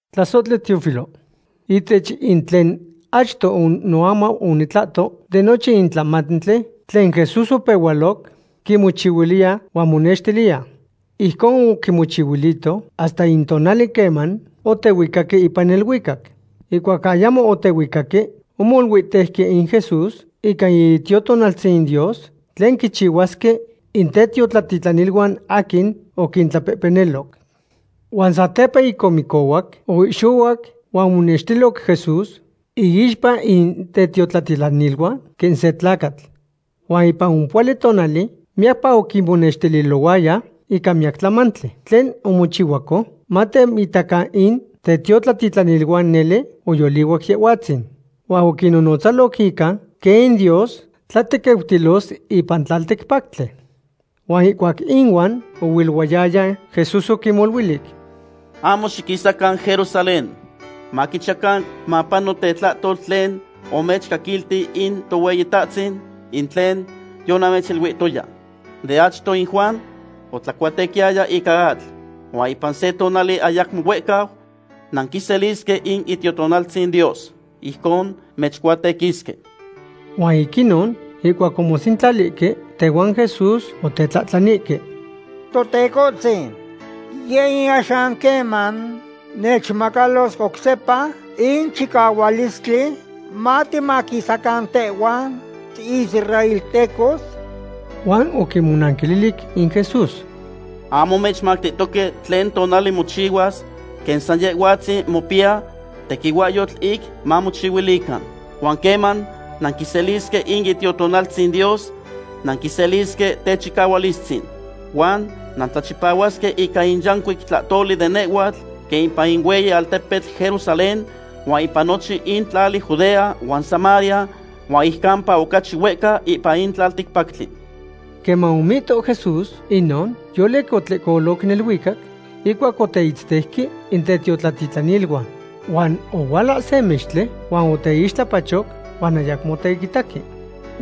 Tlasohtli Teófilo, ihtech in tlen achto noamau onitlahto de nochin in tlamantli tlen Jesús opehualoc quimochihuiliya huan monextiliya. Ijcon oquimochihuilito hasta in tonali queman otehuicaque ipan neluicac. Ihcuac ayamo otehuicaque, omoluihtejqui in Jesús ica in Itiotonaltzin Dios, tlen quichihuasque in tetiotlatitlaniluan aquin oquintlapehpeniloc. Huan satepa ic omicohuac, oihxohuac huan omonextiloc Jesús iixpa in tetiotlatitlaniluan quen se tlacatl. Huan ipan ompohuali tonali miyacpa oquinyecmonextilohuaya ica miyac tlamantli tlen omochihuaco, mateitacan in tetiotlatitlaniluan nele oyolihuac Yehhuatzin. Huan oquinnonotzaloc ica quen in Dios tlatequiutilos ipan tlalticpactli. Huan ihcuac inuan oilohuayaya, Jesús oquinmoluilic: ―Ahmo xiquisacan Jerusalén. Maquichiyacan mapano tetlahtol tlen omechmocaquilti in Tohueyitahtzin, in tlen yonamechiluihtoya. De achto in Juan otlacuatequiyaya ica atl, huan ipan se tonali ayacmo huehcau nanquiselisque in Itiotonaltzin Dios. Ijcon mechcuatequisque. Huan ic inon ihcuac omosentlalihque tehuan Jesús, otetlahtlanihque: ―¿Totecohtzin; yeh in axan queman mechmacalos oc sepa in chicahualistli matimaquisacan tehhuan israeltecos? Huan oquinmonanquililic in Jesús: ―Ahmo mechmactihtoque tlen tonali mochihuas quen san Yehhuatzin mopiya tequihuahyotl ic mamochihuilican. Huan queman nanquiselisque in Itiotonaltzin Dios nanquiselisque techicahualistzin. Huan nantlachipahuasque ica in yancuic tlahtoli de nehhuatl quen ipan in hueyi altepetl Jerusalén huan ipan nochin in tlali Judea huan Samaria, huan ic campa ocachi huehca ipan in tlalticpactli. Queman omihto Jesús inon, yolic otlehcolo neluicac ihcuac oteitzteuque in tetiotlatitlaniluan. Huan ohuala se mextli huan oteixtlapachoc huan ayacmo oteitaque.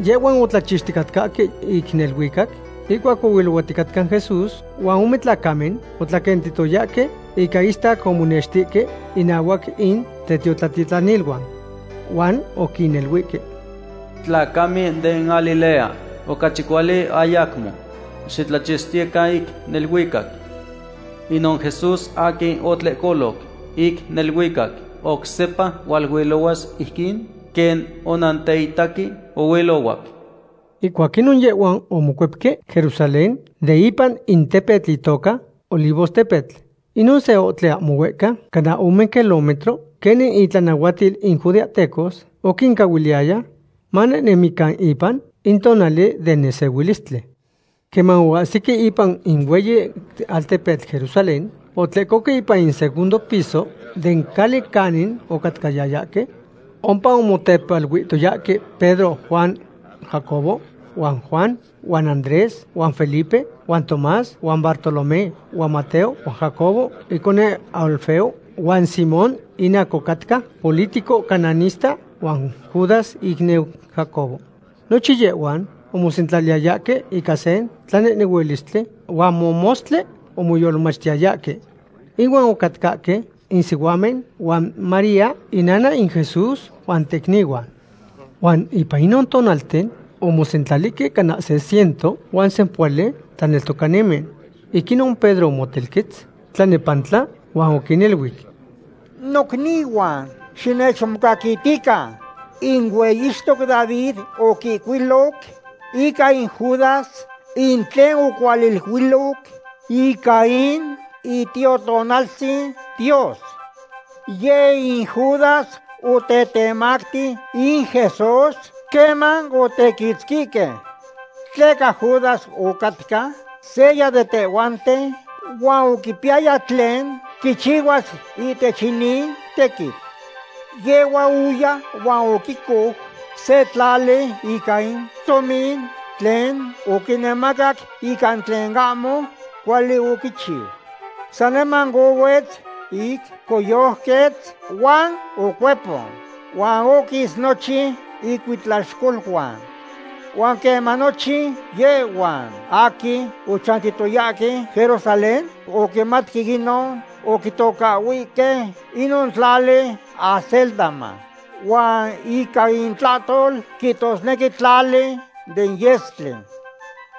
Yehhuan otlachixticatcahque ic neluicac ihcuac ohuilohuaticatca Jesús, huan ome tlacamen otlaquentihtoyahque ica istac omonextihque innahuac in tetiotlatitlaniluan. Huan oquiniluihque: ―Tlacamen den Galilea, ocachi cuali ayacmo xitlachixtiyecan ic neluicac. Inon Jesús aquin otlehcoloc ic neluicac, oc sepa hualuilohuas ijquin quen onanteitaque ohuilohuac. Ihcuac inon yehhuan omocuepque Jerusalén de ipan in tepetl itoca Olivostepetl. Inon se ohtli ahmo huehca, cana ome kilómetro, quenin in itlanahuatil in judeahtecos oquincahuiliyaya manehnemican ipan in tonali den nesehuilistli. Queman oahsique ipan in hueyi altepetl Jerusalén, otlehcoque ipan segundo piso den cali canin ocatcayayahque. Ompa omotepaluihtoyahque Pedro huan Jacobo huan Juan huan Andrés huan Felipe huan Tomás huan Bartolomé huan Mateo huan Jacobo iconeu Alfeo, huan Simón in aquin ocatca politico cananista huan Judas icniu Jacobo. Nochin yehhuan omosentlaliyayahque ica se tlanehnehuilistli huan momostli omoyolmachtiyayahque. Inuan ocatcahque in sihuamen huan María inana in Jesús, huan tecnihuan. Huan ipan inon tonalten omosentlalihque cana se ciento huan sempohuali tlaneltocanimen. Ic inon Pedro omotelquetz tlanepantla huan oquiniluic: ―Nocnihuan, xinechmocaquitican. In hueyixtoc David oquihcuiloc ica in Judas in tlen ocualiluiloc ica in Itiotonaltzin Dios. Yeh in Judas otetemacti in Jesús queman otequitzquihque. Tleca Judas ocatca seya de tehhuanten huan oquipiyaya tlen quichihuas ihtech inin tequitl. Yehhua oya huan oquicou se tlali ica in tomin tlen oquimacaque ica in tlen ahmo cuali oquichiu. Saniman ohuetz ic coyojquetz huan ocuepon, huan oquis nochin icuitlaxcoluan. Huan queman nochin yehhuan aquin ochantiyayahque Jerusalén oquimatque inon, oquitocahhuihque inon tlali Acéldama, huan ica intlahtol quihtosnequi Tlali den Yestli.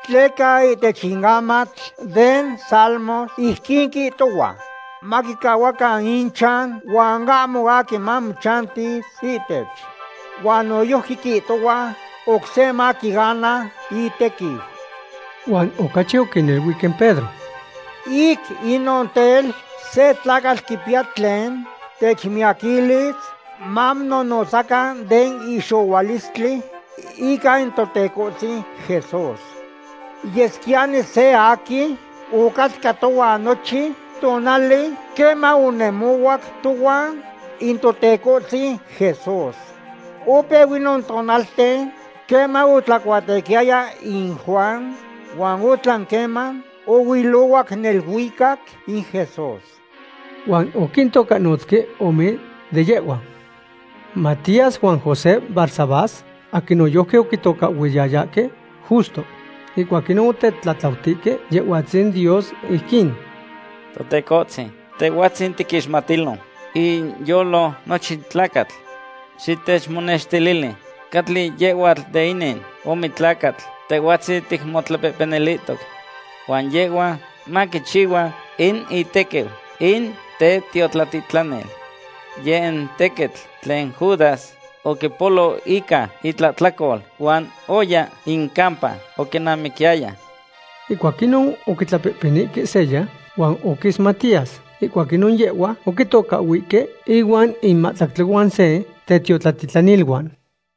Tleca ihtech in amatl den Salmos ijquin quihtohua: Maquicahuacan ichan huan ahmo aquin mamochanti ihtech. Huan noyojqui quihtohua: Oc se maquiana itequiu. Huan ocachi oquiniluic in Pedro: ―Ic inon tel, se tlacatl quipiya tlen techmiyaquilis mamononotzacan den ihxohualistli ica in Totecohtzin Jesús. Yesquiyani seya aquin ocatca tohuan nochin tonali queman onemohuac tohuan in Totecohtzin Jesús. Opeu inon tonalten queman otlacuatequiyaya in Juan huan otlan queman ohuilohuac neluicac in Jesús. Huan oquintocahnotzque ome de yehhuan: Matías huan José Barsabás, aquin noyojqui oquitocahhuiyayahque Justo. Ihcuac inon otetlatlautihque Yehhuatzin Dios ijquin: ―Totecohtzin, Tehhuatzin quinixmatilo inyolo nochin tlacatl. Xitechmonextilili catli yehhua de inin ome tlacatl Tehhuatzin ticmotlapehpenilihtoc. Huan yehhua maquichihua in itequiu in tetiotlatitlanil. Yeh in tequitl tlen Judas oquipolo ica itlahtlacol, huan oya in campa oquinamiquiyaya. Ihcuac inon oquitlapehpenihque seya, huan oquis Matías. Ihcuac inon yehhua oquitocahhuihque ihuan in mahtlactli huan se tetiotlatitlaniluan.